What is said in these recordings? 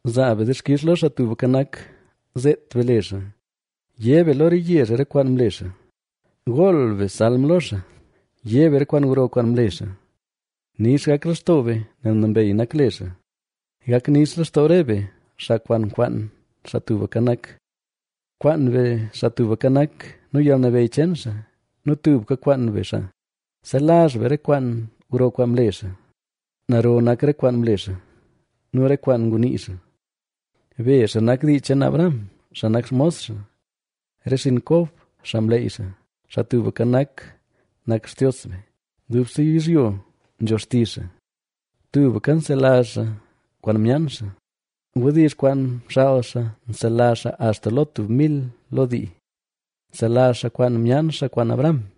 Zaa be dixkix lo Xaa Tubka Nak, ¡zeet be le xaa! yé be lo re yezh re kwaan mle xaa. ¡Gool be salm lo xaa! yé be re kwaan gro kwaan mle xaa. Nix gak lextoo be, nel nambey nak le xaa; gak nix lextoo re be, xaa kwaan nkwaan Xaa Tubka Nak. ¡Kwaan be Xaa Tubka Nak, nu yalnabeyy cheen xaa; nu tubka kwaan be xaa! Selazh be re kwaan gro kwaan mle xaa, naro nak re kwaan mle xaa nu re kwaan ngunii xaa. Be, xaa nak dii cheen Abraham, xaa nak xmos xaa, re xinn Kob, xaa mleyy xaa. Xaa Tubka Nak, nak Xtios be; dubse yizhyo nzho xtizh xaa. Tubka nselazh xaa kwaan myaan xaa; wdizh kwaan mxaal xaa nselazh xaa axta lo tub mil lo dii. Nselazh xaa kwaan myaan xaa kwaan Abrahama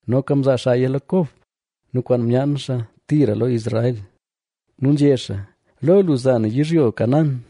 Noka mzaa xaaya lo Kob nu kwaan myaan xaa tira lo Israel, nu nzhé xaa: “Lo lu za na yizhyo Canaán,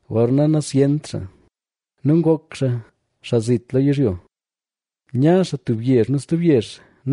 Gorna nazyent xaa nu ngok xaa, xaa zit lo yizhyo, nya xaa tub yezh nu stub yezh,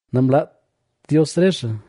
Namlaat Dios re xaa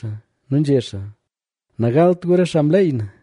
Nu nzhé xaa: “Nagalt gu re xaa mleey na;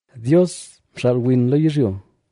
Dios mxaal win lo yizhyo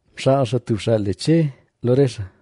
Mxaal xaa tub xaa le Che lo re xaa,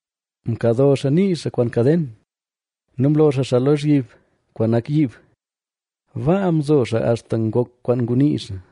Mkado xaa nii xaa kwaan kaden nu mlo xaa xaa lozhyib kwaan nak yiib. Baa mzo xaa axta ngok kwaan ngunii xaa,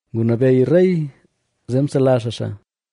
Ngunabeyy rey zee msela xaa xaa;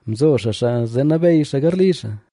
Mzo xaa xaa zee nabeyy xaa garli xaa,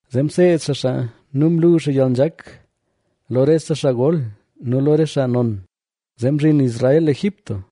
Zee mseed xaa xaa nu mlu xaa yalnzhak lo rese xaa gol nu lo re xaa non. Zee mzhin Israel Egipto,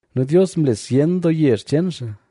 Nu Dios mle zyen doo yezh cheen xaa,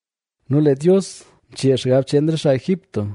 nu lee Dios mchee xgab cheen re xaa Egipto,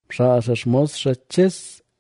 Mxaal xaa xmos xaa Ches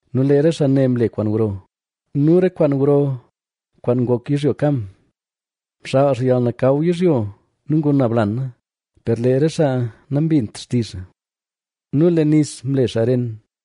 Nu lee re xaa ne mle kwaan gro nu re kwaan gro kwaan ngok yizhyo Cam. Mxaal xaa yalnakaw yizhyo nu nguna blana,o per lee re xaa nambint xtizh xaa. Nu lee nis mle xaa ren,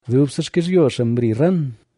Dubse xkizhyo xaa mri ran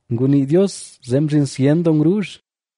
Ngunii Dios zee mzhin zyen doo ngruuzh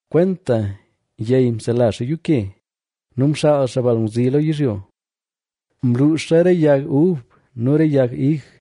Kwenta yey msela xaa yuuke, nu mxaal xaa balngwzi lo yizhyo. Mluuxa re yag ub nu re yag ig,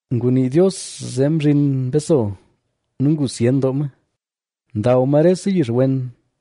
Ngunii Dios zee mzhin mbeso, nu ngu zyen doo ma. Ndaw ma rese yix wen,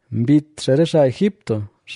Mbit xaa re xaa Egipto,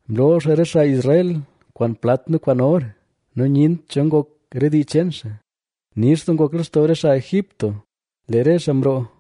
Mloo xaa re xaa Israel kwaan plat nu kwaan or, nu nyent cho ngok re dii cheen xaa. Nix doo ngok lextoo re xaa Egipto lee re xaa mroo,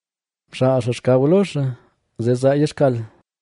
Mxaal xaa xkaw lo xaa zee zaaya xkal,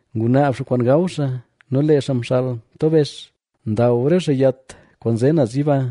Ngunaab xaa kwaan gaw xaa, nu lee xaa mxaal mtobex; ndaw re xaa yat kwaan nze naz yiba,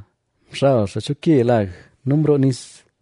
Mxal xaa cho ke lag nu mroo nis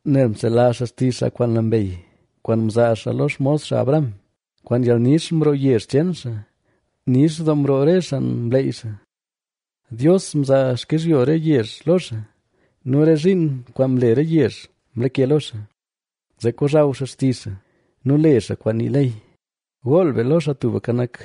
Nel mselazh xaa xtizh xaa kwaan nambey, kwaan mzaa xaa lo xmos xaa Abraham. Kwaan yalnix mroo yezh cheen xaa; nix doo mroo re xaa mleyy xaa. Dios mzaa xkizhyo re yezh lo xaaz nu re zhiin kwaan mle re yezh mlake lo xaa. Zee kozhaw xaa xtizh xaa nu le xaa kwaan nii ley. ¡Gool be lo Xaa Tubka Nak!